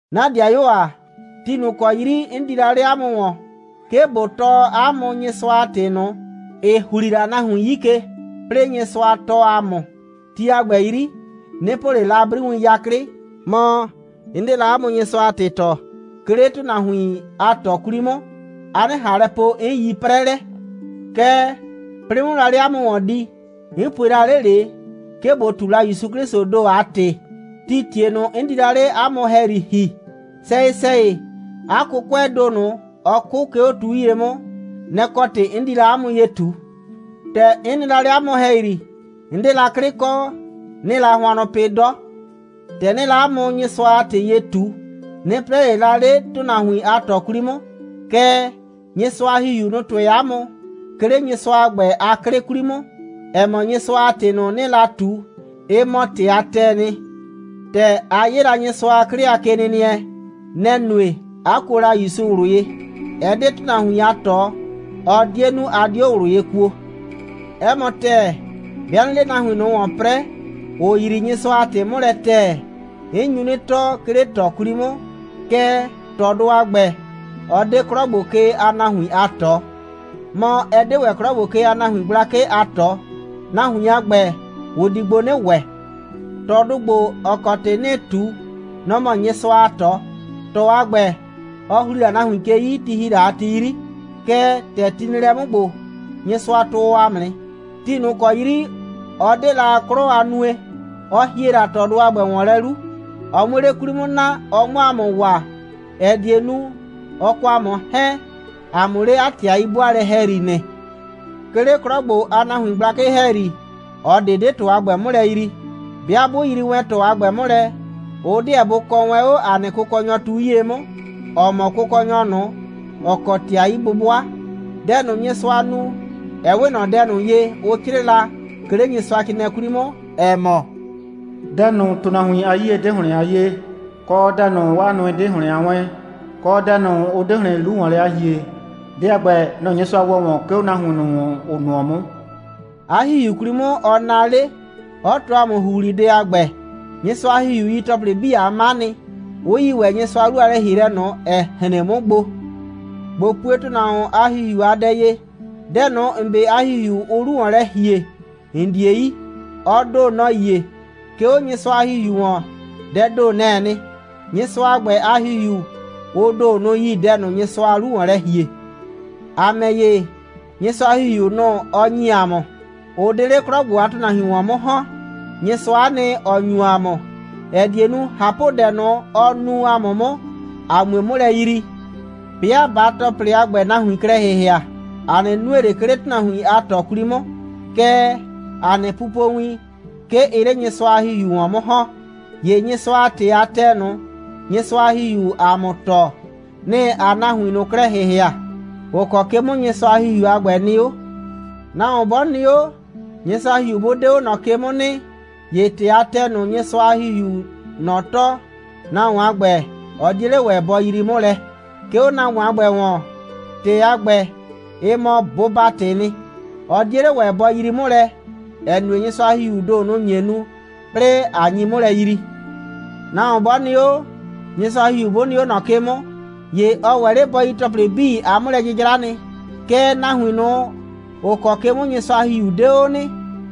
'Na ‑dɩayuo ‑a, ti ꞊nʋ ‑kɔ 'yri 'n di la 'le 'a mʋ ‑wɔn, 'ke ꞊bo tɔɔ 'a mʋ Nyɩsʋa a ‑tɩ ꞊nʋ, ‑ɩ ‑hli la nahuin 'yi ke, 'plɩɩ Nyɩsʋa tɔɔ ‑a mʋ, ti a ‑gbɛ 'yri, 'nɩ po ꞊le la 'briwin 'yaklɩ, mɔ, 'n 'de la 'a mʋ Nyɩsʋa a ‑tɩ tɔɔ, 'ke 'le ‑tʋnahuin a ꞊tɔ 'kwli 'mʋ, a 'nɩ ꞊han lɛ po, 'n yi 'prɛlɛ. Kɛɛ, 'plɩɩ 'mʋ la 'le 'a mʋ ‑wɔn di, 'n pue la 'le ꞊le, 'ke ꞊bo ꞊tu la ‑Yusu 'Klɩsʋʋ ‑do a ‑tɩ, tii ‑tie ꞊nʋ, 'n di la 'le 'a mʋ ‑hɛyri ‑hi. Sɛyɩ‑sɛyɩ, 'a 'kʋkʋɛɛ ‑do ꞊nʋ, ɔ 'kʋ, 'ke 'o tu 'yie 'mʋ, nɛ‑ kɔ ‑tɩ 'n di la 'a mʋ ye ꞊tu. ‑Tɛ 'n nɩ la 'le 'a mʋ ‑hɛyri, 'n 'de la 'klɩ kɔ, 'nɩɩ la hʋannʋ pɩ 'dɔ. ‑Tɛ 'nɩɩ la 'a mʋ Nyɩsʋa a ‑tɩ ye ꞊tu, 'nɩ 'prɛɛ ꞊le la 'le ‑tʋnahuin a ꞊tɔ 'kwli 'mʋ. Kɛɛ, Nyɩsʋa a ‑Hihiu, nʋ‑ tʋɛ 'a mʋ, 'ke 'le Nyɩsʋa a ‑gbɛ a 'klɩ 'kwli 'mʋ, ‑ɛ mɔ, Nyɩsʋa a ‑tɩ ꞊nʋ, 'nɩɩ la ꞊tu, ɩ mɔ ‑tɩ a ‑tɛɛ nɩ. ‑Tɛ a 'ye la Nyɩsʋa a 'klɩ a kenɩnɩɛ, nɛ‑ nue, 'a kuo la ‑Yusu ꞊wlʋ ye. Ɛ 'de ‑tʋnahuin a ꞊tɔ, ɔ 'die 'nu, a 'dio ꞊wlʋ ye kuo. 'Ɛ mɔ ‑tɛɛ, 'bɩa 'nɩɩ 'le nahuin ꞊nʋ ‑wɔn 'prɛɛ, ‑ʋ yrii Nyɩsʋa a ‑tɩ 'mʋ lɛ ‑tɛɛ, 'n nyu 'nɩ tɔɔ, 'ke 'le ꞊tɔ 'kwli 'mʋ, kɛɛ, ꞊tɔdʋ a ‑gbɛ, ɔ 'de 'klɔ ‑gbo ke a nahuin a ꞊tɔ. Mɔ, ɛ 'de ‑wɛ 'klɔ ‑gbo ke a nahuin gblakɩ a ꞊tɔ. Nahuin a ‑gbɛ, ʋ di gbo 'nɩ ‑wɛ. ꞊Tɔdʋ ‑gbo, ‑ɔ kɔ ‑tɩ 'nɩɩ ꞊tu, nɔ‑ mɔ Nyɩsʋa a ꞊tɔ. ꞊Tɔ a ‑gbɛ, ɔ ‑hli la nahuin ke 'yi, ti ‑hi la ti 'yri, kɛɛ, ‑tɛ ti nɩ lɛ 'mʋ ‑gbo, Nyɩsʋa tʋɔ ‑a mʋ nɩ. Ti ꞊nʋ ‑kɔ 'yri ɔ 'de la 'klɔ a nue, ɔ ‑hie la ꞊tɔdʋ a ‑gbɛ ‑wɔn lɛ 'lu, ɔ 'muo 'le 'kwli 'mʋ naa, ɔ 'mʋ ‑a mʋ waa, ‑ɛ die nu, ɔ kɔ ‑a mʋ 'hɛɛn, ‑a 'mʋ 'le 'a ‑tɩ a 'yi'bʋaalɛ ‑hɛyri nɩ. 'Ke 'le 'klɔ ‑gbo a nahuin gblakɩ ‑hɛyri, ꞊ɔ ꞊de 'de ꞊tɔ a ‑gbɛ 'mʋ lɛ yrii. 'Bɩa 'bʋ yrii wɛn ꞊tɔ a ‑gbɛ 'mʋ lɛ, ʋ 'deɛ bʋ kɔɔ wɛn 'o ‑a nɩ Kʋkɔnyɔ tu 'yie 'mʋ, ‑ɔ mɔ Kʋkɔnyɔ ꞊nʋ, ‑ɔ kɔ ‑tɩ a 'yi'bʋbʋa. Dɛ ꞊nʋ, Nyɩsʋa nu, ɛ 'we ꞊nɔ dɛ ꞊nʋ ye, ʋ 'crɩɩ la, 'ke 'le Nyɩsʋacrɩɩnɩɛ 'kwli 'mʋ, ‑ɛ mɔ: «Dɛ ꞊nʋ, ‑tʋnahuin a 'yie 'de ‑hlɩn a 'yee, kɔ, dɛ ꞊nʋ, 'waa nʋɩ 'de ‑hlɩn a 'wɛɛn, kɔ, dɛ ꞊nʋ, ʋ 'de ‑hlɩn 'lu ‑wɔn lɛ a ‑hie, dɛ a ‑gbɛ, nɛ‑ Nyɩsʋa ‑wɔ ‑wɔn, 'ke 'o nahuin ꞊nʋ ‑wɔn, ‑ʋ nʋɔ 'mʋ.» 'A ‑Hihiu 'kwli 'mʋ, ɔ naa 'le, 'ɔ tɔɔ ‑a mʋ ‑huhlidɛ a ‑gbɛ. Nyɩsʋa a ‑Hihiu yi ‑tɔplɩ 'bii a 'ma nɩ, 'ʋ yi ‑wɛ Nyɩsʋa a 'lu a lɛ‑hielɛ ꞊nʋ, ‑ɛ hren 'mʋ gbo. ꞊Bo pue ‑tʋnahuon a ‑hihiu a dɛ ye: Dɛ ꞊nʋ, ‑n 'be a ‑hihiu, ʋʋ 'lu ‑wɔn lɛ ‑hie, ‑n 'die yi. Ɔ ‑do, nɔ‑ yie. 'Ke 'o Nyɩsʋa a ‑Hihiu ‑wɔn, dɛɛ ‑do, nɛ‑ɛ nɩ. Nyɩsʋa a ‑gbɛ a ‑Hihiu, ʋ ‑do, nʋ‑ yi dɛ ꞊nʋ, Nyɩsʋaa 'lu ‑wɔn lɛ ‑hie. ‑A ‑mɛ ‑ye, Nyɩsʋa a ‑Hihiu ꞊nʋ, ɔ ‑nyi ‑a mʋ, ʋ 'de 'le 'klɔ ‑gbo a ‑tʋnahuin ‑wɔn 'mʋ ‑hɔn. Nyɩsʋa'a nɩ, ‑ɔ ‑nyu ‑a mʋ, ‑ɛ die nu, ꞊hapʋdɛ ꞊nʋ, ɔ nu ‑a mʋ 'mʋ, ‑a 'mue 'mʋ lɛ yrii. 'Bɩa ꞊baa ‑tɔplɩ a ‑gbɛ nahuin klɛ ‑hɩhɩa, ‑a 'nɩ nue ꞊le, 'ke 'le ‑tʋnahuin a ꞊tɔ 'kwli 'mʋ, kɛɛ, ‑a nɩ pupowin, 'ke ɩɩ 'le Nyɩsʋa a ‑Hihiu ‑wɔn 'mʋ ‑hɔn. ‑Ye Nyɩsʋa a ‑tɩ a ‑tɛɛ ꞊nʋ, Nyɩsʋa a ‑Hihiuu ‑a mʋ tɔɔ, nɩ‑ ‑aa nahuin ꞊nʋ klɛ ‑hɩhɩa, ‑ʋ kɔ ke 'mʋ Nyɩsʋa a ‑Hihiu a ‑gbɛ nɩ 'o. Nahuon 'bɔ nɩ 'o, Nyɩsʋa a ‑Hihiu 'bʋ 'de 'o ꞊nɔ ke 'mʋ nɩ, ‑ye ‑tɩ a ‑tɛɛ ꞊nʋ, Nyɩsʋa a ‑Hihiuu ꞊nɔ tɔɔ, nahuon a ‑gbɛ, ɔ 'die 'le ‑wɛ bɔ yrii 'mʋ lɛ. 'Ke 'o nahuon a ‑gbɛ ‑wɔn, ‑tɩ a ‑gbɛ, ɩ mɔ bʋba‑tɩɩ nɩ. Ɔ 'die 'le ‑wɛ bɔ yrii 'mʋ lɛ, ‑ɛ nue, Nyɩsʋa a ‑Hihiuu ‑do, nʋ‑ nye nu, 'plɩɩ ꞊a nyi 'mʋ lɛ yrii. Nahuon 'bɔ nɩ 'o, Nyɩsʋa a ‑Hihiu 'bʋ nɩ 'o ꞊nɔ ke 'mʋ, ‑ye ɔ ‑wɛ 'le bɔ yi ‑tɔplɩ 'bii a 'mʋlɛ'jɩjra nɩ. Kɛɛ, nahuin ꞊nʋ, ‑ʋ kɔ ke 'mʋ Nyɩsʋa a ‑Hihiu 'de 'o nɩ,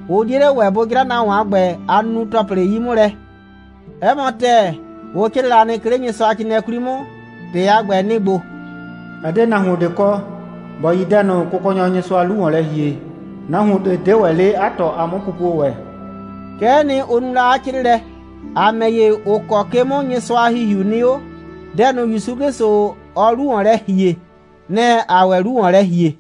ʋ 'die 'le ‑wɛ bʋ 'jra nahuon a ‑gbɛ a nunu‑tɔplɩ 'yi 'mʋ lɛ. 'Ɛ mɔ ‑tɛɛ, ʋ 'crɩɩ la nɩ, 'ke 'le Nyɩsʋacrɩɩnɩɛ 'kwli 'mʋ. ‑Tɩ a ‑gbɛ, nɩ‑ ‑gbo: «Ɛ 'de nahuon ꞊de kɔ, ‑bɔ yi dɛ ꞊nʋ, Kʋkɔnyɔ Nyɩsʋaa 'lu ‑wɔn lɛ ‑hie. Nahuon ꞊de 'de ‑wɛ 'le 'a ꞊tɔ a 'mʋpupue ‑wɛ.» Kɛ'ɛ nɩ, ʋ nu la 'a 'crɩɩlɛ. ‑A ‑mɛ ‑ye, ‑ʋ kɔ ke 'mʋ Nyɩsʋa a ‑Hihiu nɩ 'o, dɛ ꞊nʋ, ‑Yusu 'Klɩsʋ, ɔɔ 'lu ‑wɔn lɛ ‑hie, nɛ‑ ‑aa ‑wɛ 'lu ‑wɔn lɛ ‑hie.